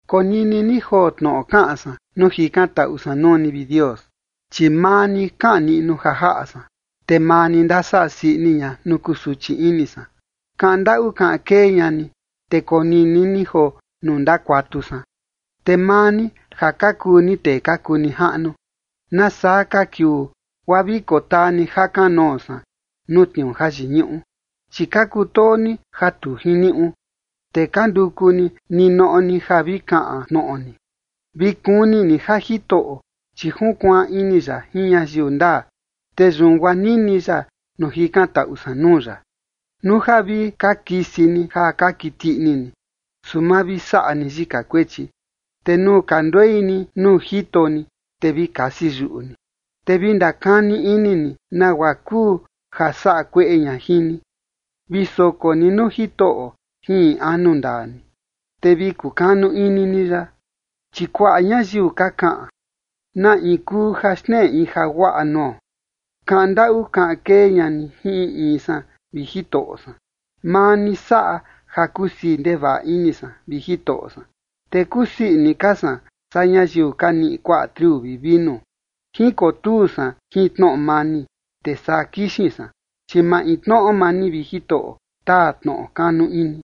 Konini ni joo tnoꞌo kaꞌan san nuu jikantaꞌu san nuu ni, vi Dios, chi maa ni kaꞌan niꞌnu ja jaꞌa san, te maa ni ndasaꞌa sii ini ña nuu kusuchi ini san. Kaꞌan ndaꞌu kaꞌan kee ña ni, te konini ni joo nuu ndakuatu san. Te maa ni ja ka kuu ni tee ka kuu nijaꞌnu, ¿Nasaa ka kiuu guaa vi kotaa ni ja kanoo san nuu tniuu jayiñuꞌu? Chi ka kutoo ni ja tu jiniuꞌu, te ka nduku ni ninoꞌo ni ja vi kaꞌan tnoꞌo ni. Vi kuni ni ja Jitoꞌo, chi junkuaan ini ya jin ñayiu ndaa, te yun guaa nini ya nuu jikantaꞌu san nuu ya. Nuu ja vi ka kisi ni ja ka kiti ini ni, su ma vi saꞌa ni yika kuechi. Te nuu ka nduei ni nuu jito ni, te vi kasi yuꞌu ni, te vi ndakani ini ni nagua kuu ja saꞌa kueꞌe ña jin ni. Vi soko ni nuu Jitoꞌo jin in anu ndaa ni, te vi kukanu ini ni ya. Chi kuaꞌa ñayiu ka kaꞌan: “¿Na in kuu ja xneꞌe in jaguaꞌa nuo?” Kaꞌan ndaꞌu kaꞌan kee ña ni jin in in san, vi Jitoꞌo san. Maa ni saꞌa ja kusii ndevaꞌa ini san, vi Jitoꞌo san, te kusii ini ka san saa ñayiu ka niꞌi kuaꞌa triu vi vinu. Jinkotuu san jin tnoꞌo mani, te saa kixin san, chi maintnoꞌo maa ni, vi Jitoꞌo, taa tnoꞌo kanu ini.